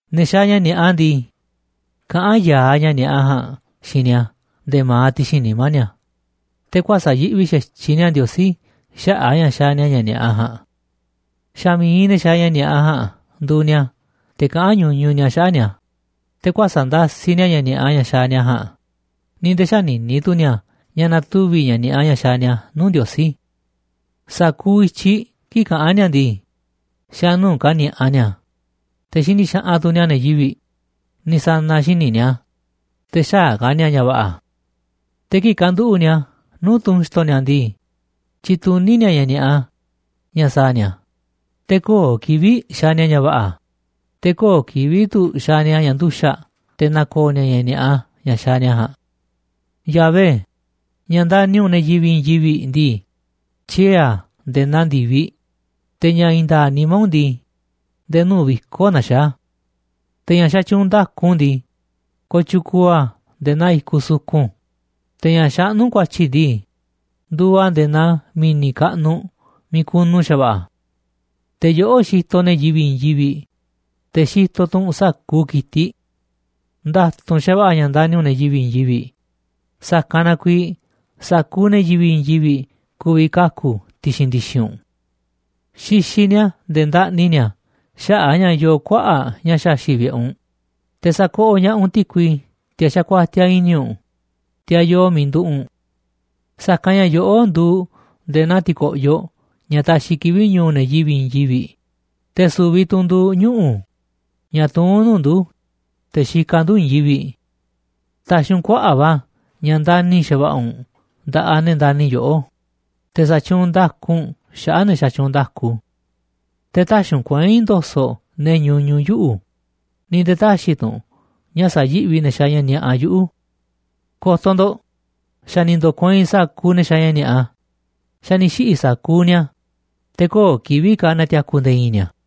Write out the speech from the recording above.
Ne̱ xaaꞌ ña̱ ni̱a̱ꞌa ndii, kaꞌán ya̱aꞌ ña̱ ni̱a̱ꞌa ja̱a̱nꞌ xiinꞌ ni̱a̱ nde̱e̱ ma̱aꞌ ti̱xi̱n nimá ni̱a̱, te̱ kuäsa̱ꞌ yiꞌvi xa̱tyiꞌ ni̱a̱ Ndiosí xaꞌa̱ꞌ a̱ ña̱ xaaꞌ ni̱a̱ ña̱ ni̱a̱ꞌa ja̱a̱nꞌ. Xa̱ mi̱iꞌ ne̱ xaaꞌ ña̱ ni̱a̱ꞌa ja̱a̱nꞌ nduuꞌ ni̱a̱ te̱ kaꞌán ñuñuꞌ ni̱a̱ xaꞌa̱ꞌ ni̱a̱, te̱ kuäsa̱ꞌ ndasiꞌ ni̱a̱ ña̱ ni̱a̱ꞌa ña̱ xaaꞌ ni̱a̱ ja̱a̱nꞌ, ni̱ nde̱e̱ xänini tu̱ ni̱a̱ ña̱ na̱tuvi̱ ña̱ ni̱a̱ꞌa ña̱ xaaꞌ ni̱a̱ nuu̱ꞌ Ndiosí. Sa̱kuuꞌ i̱tyiꞌ kii̱ꞌ kaꞌán ni̱a̱ ndii, xa̱ nuu̱ꞌ kani̱a̱ꞌa ni̱a̱, te̱ xini xaꞌanꞌ tu̱ ni̱a̱ ne̱ yivi̱ꞌ, ni̱ sa̱na̱ xíniꞌ ni̱a̱, te̱ xäaꞌ ka̱ ni̱a̱ ña̱ va̱ꞌa̱. Te̱ kii̱ꞌ kanduꞌu̱ꞌ ni̱a̱ nuu̱ꞌ tunꞌ xi̱to̱ ni̱a̱ ndii, tyituní ni̱a̱ ña̱ ni̱a̱ꞌa ña̱ sa̱a̱ ni̱a̱, te̱ köo̱ꞌ kivi̱ꞌ xaaꞌ ni̱a̱ ña̱ va̱ꞌa̱, te̱ köo̱ꞌ kivi̱ꞌ tu̱ xaaꞌ ni̱a̱ ña̱ nduxa̱ꞌ te̱ na̱ko̱o̱ ni̱a̱ ña̱ ni̱a̱ꞌa ña̱ xaaꞌ ni̱a̱ ja̱a̱nꞌ. Yahvé, ña̱ ndani̱ u̱nꞌ ne̱ yivi̱ꞌ i̱i̱n yivi̱ꞌ ndii, tyiee̱ a̱ nde̱e̱ naa ndi̱viꞌ, te̱ ña̱ i̱i̱n nda̱a̱ꞌ nimá u̱nꞌ ndii, nde̱e̱ nuu̱ꞌ viko̱ꞌ naxaá a̱. Te̱ ña̱ xatyuunꞌ nda̱ku u̱nꞌ ndii, kooꞌ tyukuuꞌ a̱ nde̱e̱ naa i̱kuꞌ sukun, te̱ ña̱ xaꞌnú u̱nꞌ ku̱a̱tyi̱ ndii, nduuꞌ a̱ nde̱e̱ naa mi̱ni̱ kaꞌnuꞌ miiꞌ kunu xa̱va̱ꞌa̱. Te̱ yoꞌó xitoꞌ ne̱ yivi̱ꞌ i̱i̱n yivi̱ꞌ, te̱ xitoꞌ tu̱ u̱nꞌ sa̱kuuꞌ ki̱tiꞌ. Nda̱tu̱nꞌ xa̱va̱ꞌa̱ ña̱ ndani̱ u̱nꞌ ne̱ yivi̱ꞌ i̱i̱n yivi̱ꞌ, sa̱kanꞌ na kuiiꞌ sa̱kuuꞌ ne̱ yivi̱ꞌ i̱i̱n yivi̱ꞌ ku̱vi̱ kaku̱ ti̱xi̱n ndi̱xi̱n u̱nꞌ. Xixiꞌ ni̱a̱ nde̱e̱ ndaꞌni ni̱a̱ xaꞌa̱ꞌ a̱ ña̱ yoo kuaꞌa̱ꞌ ña̱ xaxi̱ꞌ vi̱ꞌe̱ u̱nꞌ, te̱ sa̱koꞌoꞌ ña̱ꞌaꞌ u̱nꞌ ti̱kui teꞌ xakuatiaꞌ i̱ni̱ u̱nꞌ, teꞌ yoo miiꞌ nduꞌu̱ꞌ u̱nꞌ. Sa̱kanꞌ ña̱ yoꞌó nduuꞌ nde̱e̱ naa ti̱ko̱ꞌyoꞌ ña̱ taxiꞌ kivi̱ꞌ ñu̱u̱ ne̱ yivi̱ꞌ i̱i̱n yivi̱ꞌ, te̱ su̱vi̱ tu̱ u̱nꞌ nduuꞌ ñuꞌu̱ ña̱ tuún nuu̱ꞌ ndu̱, te̱ xikaꞌ ndu̱ i̱i̱n yivi̱ꞌ. Ta̱xi̱ u̱nꞌ kuaꞌa̱ꞌ va̱ ña̱ ndani̱ xa̱va̱ꞌa̱ u̱nꞌ nda̱ꞌaꞌ ne̱ ndani̱ yoꞌó, te̱ sa̱tyuunꞌ nda̱ku u̱nꞌ xaꞌa̱ꞌ ne̱ xatyuunꞌ nda̱ku. Te̱ tä̱xi̱ u̱nꞌ kuei̱n ndo̱so̱ꞌ ne̱ ñuñuꞌ yuꞌu̱, ni̱ nde̱e̱ tä̱xi̱ tu̱ u̱nꞌ ña̱ sa̱yi̱ꞌvi ne̱ xaaꞌ ña̱ ni̱a̱ꞌa yuꞌu̱. Ko̱to̱ ndo̱ꞌ, xa̱ ni̱ ndo̱kueinꞌ sa̱kuuꞌ ne̱ xaaꞌ ña̱ ni̱a̱ꞌa, xa̱ ni̱ xiꞌi̱ sa̱kuuꞌ ni̱a̱, te̱ köo̱ꞌ kivi̱ꞌ ka̱ na̱ti̱a̱ku̱ nde̱e̱ i̱i̱n ni̱a̱.